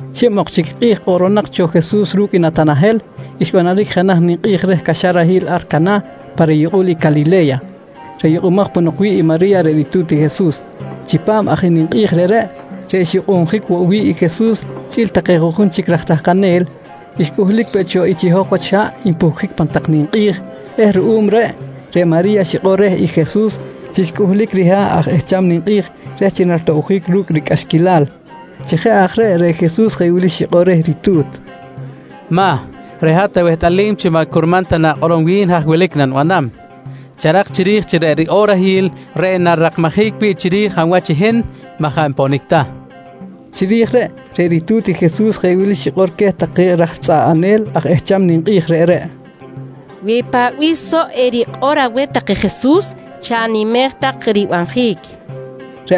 Xib ok chic kꞌi̱j kꞌoꞌronak cho Jesus ru̱cꞌ i Natanahel, xbanaric jenaj ninkꞌi̱j reh caxarahil ar Canah pa riyukꞌul i Calile̱ya, reꞌ yukꞌumaj ponok wi̱ꞌ i Mari̱ya reꞌ ritu̱t i Jesus. Chipam aj i ninkꞌi̱j reꞌreꞌ, reꞌ xyukꞌunjic woꞌ wi̱ꞌ i Jesus chꞌi̱l take juꞌjun chic raj tahkanel, xcꞌuhlic peꞌ cho i chiho̱j wach haꞌ npuhcjic pan tak ninkꞌi̱j eh ruꞌum reꞌ, reꞌ Mari̱ya xikꞌor reh i Jesus chi xcꞌuhlic riha̱ꞌ aj ehcham ninkꞌi̱j reh chi naritoꞌbjic ru̱cꞌ ricꞌaxquilal. Chi jeꞌ aj reꞌ, reꞌ Jesus jeꞌ wili xikꞌor reh i ritu̱t: «Mah, reꞌ hat awehtꞌalim chi maꞌ curman ta na̱kꞌorom wi̱n haj wilic i nanibanam. Charak chiri̱j chi reꞌ riꞌorahil reꞌ narirakmajic wi̱ꞌ chiri̱j hab wach i hin maꞌ jaꞌ nponic ta, nqui reh. Chiri̱j reꞌ, reꞌ ritu̱t i Jesus jeꞌ wili xikꞌor queh take raj tzꞌaꞌanel aj ehcham ninkꞌi̱j reꞌreꞌ: «Wi paꞌ bih soꞌ erikꞌor aweh tak i Jesus chanimej tak ribanjic, nqui queh.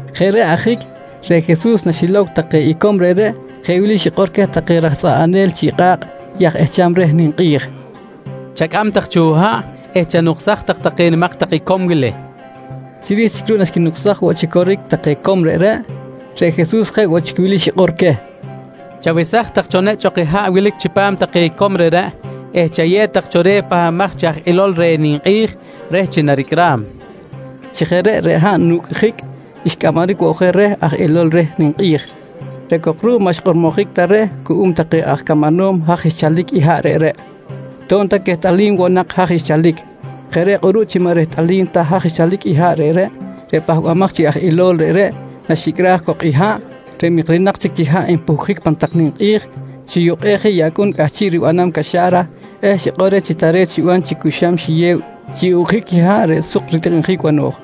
Jeꞌ reꞌ ajic reꞌ Jesus naxilow take icom reꞌreꞌ jeꞌ wili xikꞌor queh take raj tzꞌaꞌanel chiꞌ kꞌa̱kꞌ i aj ehcham reh ninkꞌi̱j: «Chacꞌam tak cho haꞌ eh chanuksaj tak take nimak tak icom wili, nqui queh. Chiri̱j chic ruꞌ naxquinuksaj woꞌ chi coric take icom reꞌreꞌ, reꞌ Jesus jeꞌ woꞌ chic wili xikꞌor queh: «Chawesaj tak cho nechꞌ ok i haꞌ wilic chipam take icom reꞌreꞌ eh chayew tak cho reh pahbamaj chi aj ilol reh ninkꞌi̱j reh chi naricꞌram, nqui queh. Chi jeꞌ reꞌ, reꞌ haꞌ nucꞌjic xcꞌamaric woꞌ je reh aj ilol reh ninkꞌi̱j, reꞌ cok ruꞌ maꞌ xkꞌormojic ta reh cuꞌum take aj camanom haj xchalic i haꞌ reꞌreꞌ to̱b ta quehtꞌalim woꞌ nak haj xchalic. Jeꞌ reꞌ kꞌuruꞌ chi maꞌ rehtꞌalim ta haj xchalic i haꞌ reꞌreꞌ, reꞌ pahbamaj chi aj ilol reꞌreꞌ naxicꞌraj cok i haꞌ reꞌ mikcrinak chic chi haꞌ npuhcjic pan tak ninkꞌi̱j, xiyukꞌej je i acꞌun cꞌahchiꞌ ribanam caxa̱ra eh xikꞌor reh chi tare̱t xiban chi cu xam xiyew chi ucꞌjic i haꞌ reꞌ suk ritikꞌinjic bano̱j.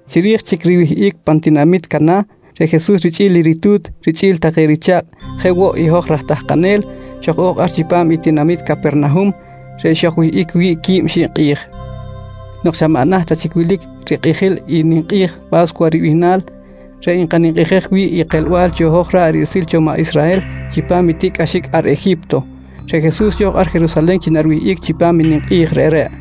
Chiri̱j chic riwihꞌic pan tinamit Canah, reꞌ Jesus richꞌi̱l i ritu̱t richꞌi̱l take richa̱kꞌ jeꞌ woꞌ i hoj raj tahkanel, xoj-o̱j ar chipam i tinamit Capernahum reꞌ xojwihꞌic wi̱ꞌ quib xib kꞌi̱j. Nok xa maꞌ naht ta chic wilic rikꞌijil i ninkꞌi̱j Pa̱scuwa ribihnal reꞌ nkaninkꞌijej wi̱ꞌ i kelbal cho hoj ra̱ꞌ riꞌsil cho maꞌ Israhel chipam i tiꞌcꞌaxic ar Eji̱pto, reꞌ Jesus xo̱j ar Jerusalen chi nariwihꞌic chipam i ninkꞌi̱j reꞌreꞌ.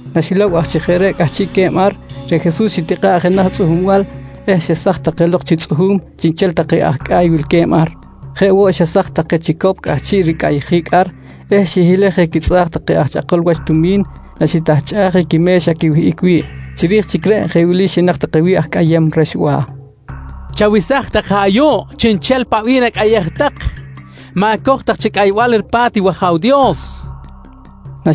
Naxilow aj chi jeꞌ reꞌ cꞌahchiꞌque̱b ar, reꞌ Jesus xitikꞌa̱ꞌ jenaj tzꞌuhumbal eh xesaj take lok chi tzꞌuhu̱m chiꞌnchel take aj cꞌa̱y wilque̱b ar. Jeꞌ woꞌ xesaj je take chicop cꞌahchiꞌ ricꞌayjic ar eh xihilej je quitzꞌa̱k take aj chꞌakol wach tumi̱n naxitahchꞌaj je quime̱xa quiwihꞌic wi̱ꞌ. Chiri̱j chic reꞌ jeꞌ wili xinak take wi̱ꞌ aj cꞌayem rexba̱: «Chawesaj tak je ayuꞌ chiꞌnchel paꞌ bih nacꞌayej tak. Ma̱coj tak chi cꞌaybal ripa̱t i wAja̱w Dios, nqui queh.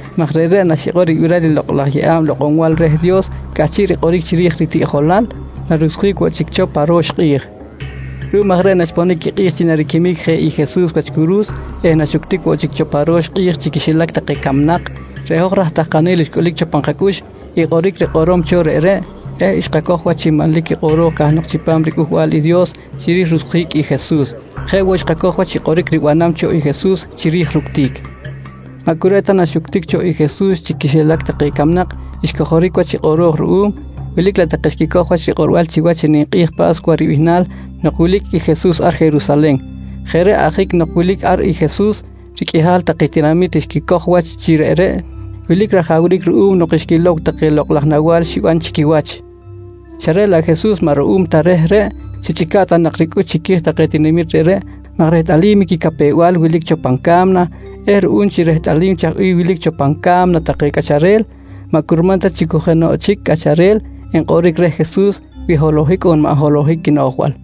maj reꞌreꞌ naxikꞌor ribiral i lokꞌ laj yeꞌa̱b lokꞌonbal reh Dios cꞌahchiꞌ rikꞌoric chiri̱j i ritiꞌjolal narucsjic woꞌ chic cho pa ro̱x kꞌi̱j. Ruꞌum aj reꞌ naxponic i kꞌi̱j chi nariquimic je i Jesus wach curu̱s eh naxuctic woꞌ cho pa ro̱x kꞌi̱j chi quixilac take camnak, reꞌ hoj raj tahkanel xcꞌulic cho pan kacꞌux i kꞌoric rikꞌorom cho reꞌreꞌ eh xkacoj wach chi manlic i kꞌoro̱j cahnok chipam riCꞌuhbal i Dios chiri̱j rucsjic i Jesus, jeꞌ woꞌ xkacoj wach i kꞌoric ribanam cho i Jesus chiri̱j i ructic. Maꞌ cu reꞌ ta naxuctic cho i Jesus chi quixilac take camnak xcojoric wach i kꞌoro̱j ruꞌum, wilic laꞌ take xquicoj wach rikꞌorbal chiwach i ninkꞌi̱j Pa̱scuwa ribihnal nok wilic i Jesus ar Jerusalen. Jeꞌ reꞌ ajic nok wilic ar i Jesus, riqꞌuihal take tinamit xquicoj wach chi reꞌreꞌ wilic rajawric ruꞌum nok xquilow take lokꞌ laj nawa̱l xiban chi quiwach xa reꞌ laꞌ Jesus maꞌ ruꞌum ta reh reꞌ, xichꞌica̱ꞌ ta nak ricꞌux chiqui̱j take tinamit reꞌreꞌ maj rehtꞌalim i quicapew-bal wilic cho pan ca̱mna eh ruꞌum chi rehtꞌalim chaj bih wilic cho pan ca̱mna take cꞌacharel, maꞌ curman ta chi cu jenoꞌ chic cꞌacharel enkꞌoric reh Jesus wi holohic on maꞌ holohic quinoꞌjbal.